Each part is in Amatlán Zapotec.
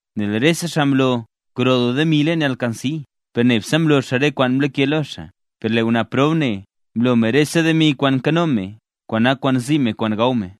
Nel rese xaa mlo gro doo demi leen alkansi, per nebse mlo xaa re kwaan mlake lo xaa. Per lee ngwnaa prob ne mlo rese demi kwaan nkano me kwaan nak kwaan zi me kwaan gaw me.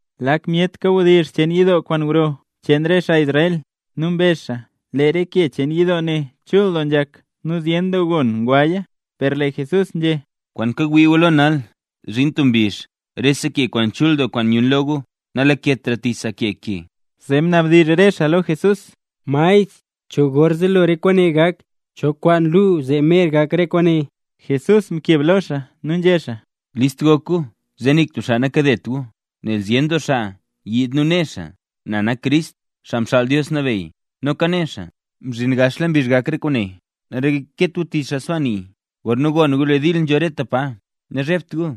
Lak myet kawdizh cheen yidoo kwaan gro cheen re xaa Israel. Nu mbezh xaa lee re ke cheen yidoo ne chul doo nzhak nu zyen doo gon ngwaya. Per lee Jesús nzhé: —Kwaan kawii gu lo nal, zhin tub mbizh rese ke kwaan chul doo kwaan nyun lo gu, nalaketra tich sa ke ke. Zee mnabdizh re xaa lo Jesús: —Maestr, ¿cho gor zelo re kwaane gak? ¿Cho kwaan luu zee mer gak re kwaane? Jesús mkeb lo xaa nu nzhé xaa: —List gok gu zee nik tub xaa nakadet gu. Nel zyen doo xaa yiid nu né xaa: “Na nak Crist, Xaa Mxaal Dios Nabeyy”. Noka né xaa: “Mzhin gaxla mbizh gak re kwaane”. Nareket gu tich re xaa sbaa nii. Gorna gon gu lee dil nzho rete pa, nazhebt gu.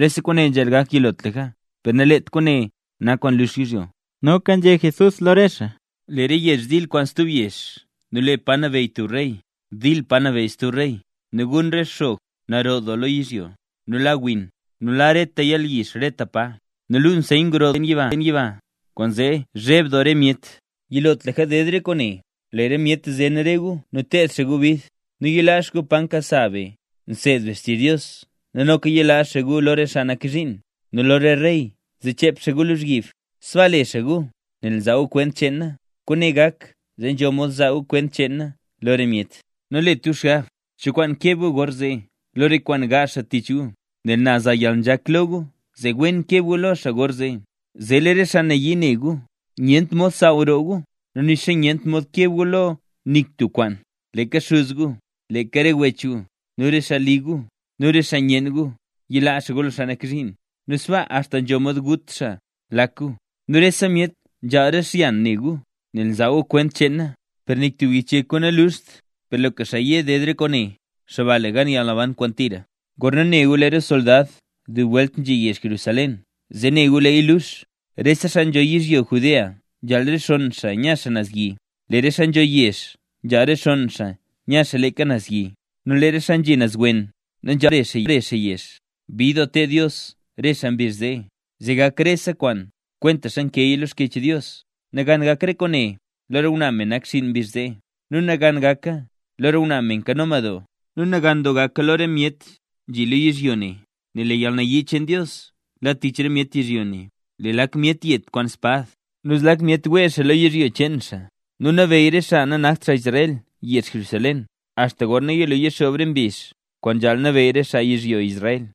Rese kwaane nzhaal gak yilotlaka; per nalet re kwaane nak kwaan lux yizhyo. Noka nzhé Jesús lo re xaa: —Lee re yezh dil kwaan stub yezh nu lee pa nabeyy tub rey dil kwaan pa nabeyy stub rey. Nu gun re xog naro doo lo yizhyo, nu la win, nu la reta yalyizh reta pa. Nu luu nseyn gro doo naz leen yiba, kwaanzee cheb doo re myet. Yilotlaka ded re kwaane, lee re myet zen re gu nu ted xaa gu bid, nu yilaa xaa gu pa nkasa be nseed be xtizh Dios nu noka yilaa xaa gu lo re xaa nak zhiin nu lo re rey zee chep xaa gu lozhyib. Sbaa le xaa gu nel nzaa gu kwent cheen na. Kwaane gak zee nzho mod zaa gu kwent cheen na lo re myet. Nu nalet gu xgab cho kwaan keb gu gorzee lo re kwaan gaazh xaa tich gu. Nel na za yalnzhak lo gu zee wen keb gu lo xaa gorzee; zee lee re xaa nayii ne re gu nyent mod saaw roo gu, nu nixa nyent mod keb lo gu nik tub kwaan. Leeka xuz gu, leeka re wech gu, nu re xaa li gu, nu re xaa nyenn gu, yilaa xaa gu lo xaa nak zhiin, nu sbaa axta nzho mod gut xaa lak gu. Nu rese myet zhaal xyan ne gu, nel nzaa gu kwent cheen na. Per nik tub yich yek gu naluxt. Per loka xaa ye ded re kwaane, xaa ba le gan yalnaban kwaan tira. ’Gorna ne gu lee re soldad dub welt nzhi yezh Jerusalén zee ne gu leeya lux. Re xaa nzho yizhyo Judea nzhaal rexonn xaa nya xaa naz yi, lee re xaa nzho yezh nzhaal rexonn nya leeka naz yi, nu lee re xaa nzhi naz wen nanzhaaltra bare xaa yezh. Bid doo ted Dios re xaa mbizh zee, zee gak rese kwaan kwentaxa nkeeya lo Xkyech Dios. Nagan gak re kwaane lo re ngwnaa me nakxiin mbizh zee. Nu nagan gaka lo re ngwnaa me nkano madoo, nu nagan doo gaka lo re myet nzhi lo yizhyo ne, nel lee yalnayii cheen Dios la tich re myet yizhyo ne. Lee lak myet yet kwaan spad, nu zlak myet wee xaa lo yizhyo cheen xaa. Nu nabeyy re xaa nanakt xaa Israel yezh Jerusalén, axta gorna yilo yixoob re mbizh kwaan nzhaal nabeyy re xaa yizhyo Israel.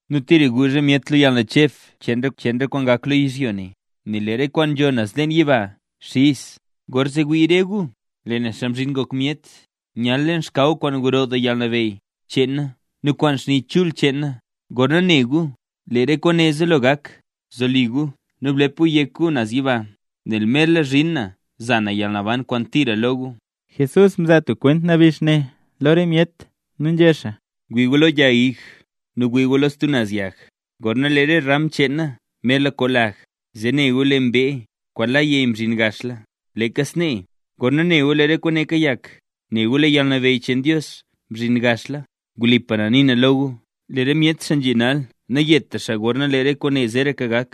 Nu tira guuzh re myet lo yalnacheb cheen re kwaan gak lo yizhyo ne, nel lee re kwaan nzho naz leen yiba xiz. Gorzee wii re gu, lee na Xaa Mzhin Ngok Myet, nyal leen xkaw kwaan gro doo yalnabeyy cheen na nu kwaan xni chul cheen na. Gorna ne gu lee re kwaane zelo gak, zoli gu nu blep gu yek gu naz yiba nel merla zhin na za na yalnaban kwaan tira lo gu. Jesús mzaa tub kwent nabix ne lo re myet, nu nzhé xaa: —Wii gu lo yag ig nu wii gu lo stub naz yag. Gorna lee re ram cheena merla koo lag, zee ne gu lee mbee kwaan la neey mzhin gaxla. Leeka snee, gorna ne gu lee re kwaane kayak, nela gu lee yalnabeyy cheen Dios nzezhin gaxla. Wlipa na nii na lo gu, lee re myet xaa nzhi nal nayeta xaa gorna lee re kwaane zeeraka gak.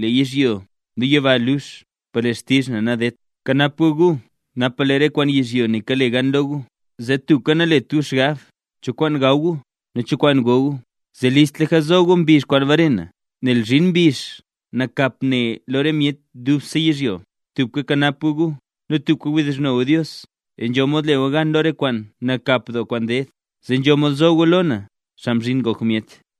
Lee yizhyo nu yiba lux per lee xtizh na nadedt. ’Bkanap gu gu napa lee re kwaan yizhyo ne kale gan lo gu, zee tubka nalet gu xgab cho kwaan gaw gu nu cho kwaan go gu zee listlaka zo gu mbizh kwaan bare na, nel zhin mbizh nakap ne lo rese myet dubse yizhyo. Tubka bkanap gu gu, nu tubka wdizhno gu Dios zee nzho mod le gu gan lo re kwaan nakap doo kwaan ded, nu zee nzho mod zo gu lo na, Xaa Mzhin Ngok Myet.